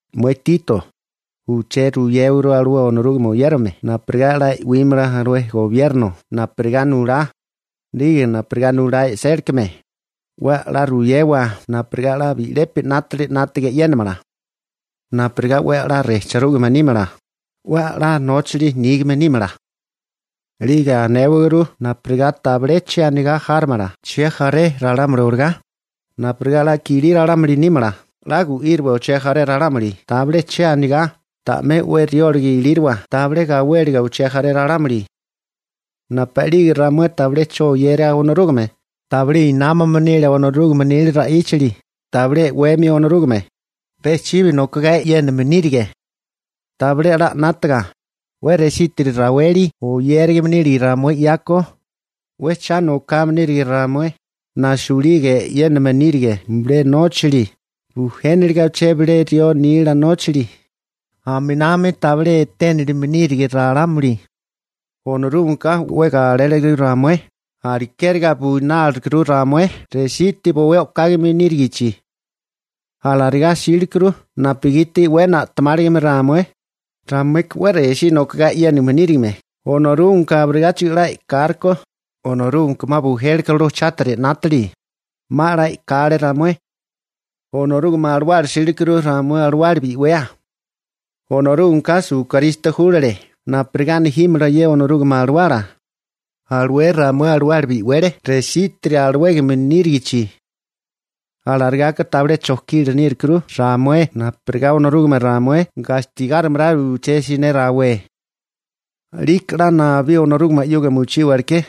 Mué Tito, uché ruyéwaguru alué Onorúgame oyérame napurigá 'la e'wímala alué gobierno napurigá nulá, 'lige napurigá nulá e'sélikame, 'we 'la ruyewa napurigá 'la bi'lepi 'nátili 'nátaga e'yénamala, napurigá 'we 'la rejchirúgame nímala 'we 'la nóchali nígame nímala. 'Lige anéwaguru napurigá tabilé che anigá járomala chejaré ralámuli olagá, napurigá 'la kilí ralámuli nímala, 'la gu'íriwa uché jaré ralámuli tabilé che anigá, ta'mé 'we rióliga ilírowa tabilé gawéliga uché jaré ralámuli. Napu'lige ramué tabilé 'cho oyeria Onorúgame, tabilé inámame nile Onorúgame nila ra'íchali, tabilé e'weme Onorúgame. Pe chibi nokogá e'yéname nírige, tabilé 'la 'nátaga. 'We resítiri raweli oyérame nírige ramué 'yako. 'We cha nokame nírige ramué, nasuliga e'yéname nírige bilé nóchali, bujéniliga uché bilé rió nila nóchali. Aminami tabilé eténilime nírige ralámuli. Onorúgameka 'we galele ramué, alekeri buinálirukuru ramué resiti bowé o'kame nírigichi. Alarigá 'sílekuru napugiti 'we na'temáligame ramué. Ramueka 'we resí nokogá e'yéname nírigime, Onorúgameka abirigáchigo 'la e'kálekó. Onorúgameka 'ma bujélekuru alué chátiri 'nátili. 'Ma 'la e'kale ramué. Onorúgame Alawala 'sílikuru ramué alawala bi'wea. Onorúgameka Esukristo júlale napurigá nejímala ye Onorúgame Alawala. Alué ramué alawala bi'wele resítiri alawégame nírigichi. Alarigaka tabilé chojkila nírukuru ramué napurigá Onorúgame ramué gastigárimala uché siné rawé, 'liko 'la nabí Onorúgame 'yuga mochíwaleké.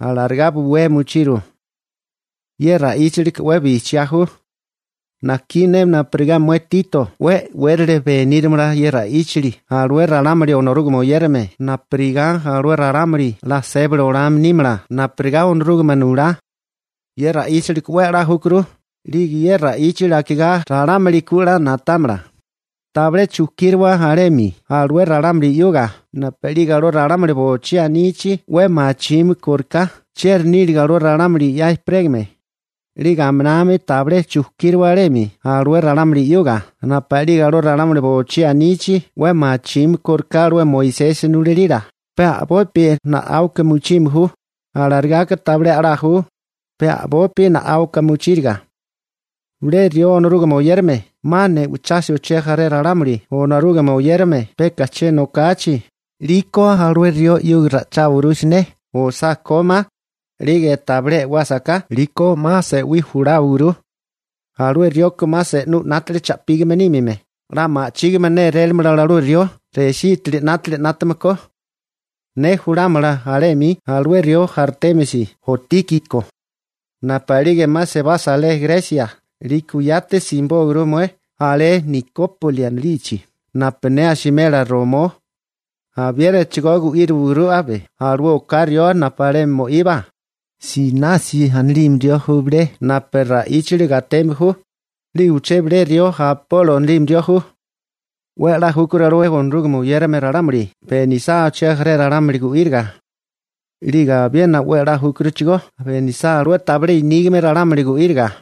Alarigá buwea mochiru. Ye ra'íchalika 'we bijchiá ju. Najkí ne napurigá mué Tito 'we e'wérili benírimala ye ra'íchali alué ralámuli Onorúgame oyérame napurigá alué ralámuli 'la sébali olame nímala napurigá Onorúgame nulá. Ye ra'íchali 'we 'la júkuru, 'lige ye ra'íchali akigá ralámuli ku 'la na'támala. Tabilé chujkíriwa alemi alué ralámuli 'yuga napu'lige alué ralámuli bochí anichi 'we machime kóriká chieri níliga alué ralámuli 'ya ejperégame, 'lige aminami tabilé chujkíriwa alemi alué ralámuli 'yuga napu'lige alué ralámuli bochí anichi 'we machime kóriká alué Moisesi nulalila. Pe a'bopi na'áuka mochime ju. Alarigaka tabilé 'la ju, pe a'bopi na'áuka mochíriga. Bilé rió Onorúgame oyérame 'ma ne'ochasa uché jaré ralámuli Onorúgame oyérame peka che nokachi, 'liko alué rió 'yuga ra'icháwaguru siné, osá kómá, 'lige tabilé e'wásaká 'liko 'ma se'wí juláwaguru. Alué rioka 'ma se'nú 'nátili cha'pígame nímime, 'la ma'chígame nélélamala alué rió resitiri 'nátili 'nátame ko. Ne julámala alé 'mi alué rió Artémasi o Tíkiko. Napu'lige 'ma sebasa alé Gresia 'liko yati simibóaguru mué alé Nikópoli anilichi napu ne asimela romó. Abiénachigó gu'íriwaguru abe alué oká rió napu alemi mo'iba, Senasi anilime rió ju bilé napu ra'íchali gateme ju, 'lige uché bilé rió Apolo anilime ju. 'We 'la júkuru alué Onorúgame oyérame ralámuli benisá uché jaré ralámuli gu'íriga. 'Lige abiena 'we 'la júkuruchigó benisá alué inígame ralámuli gu'íriga.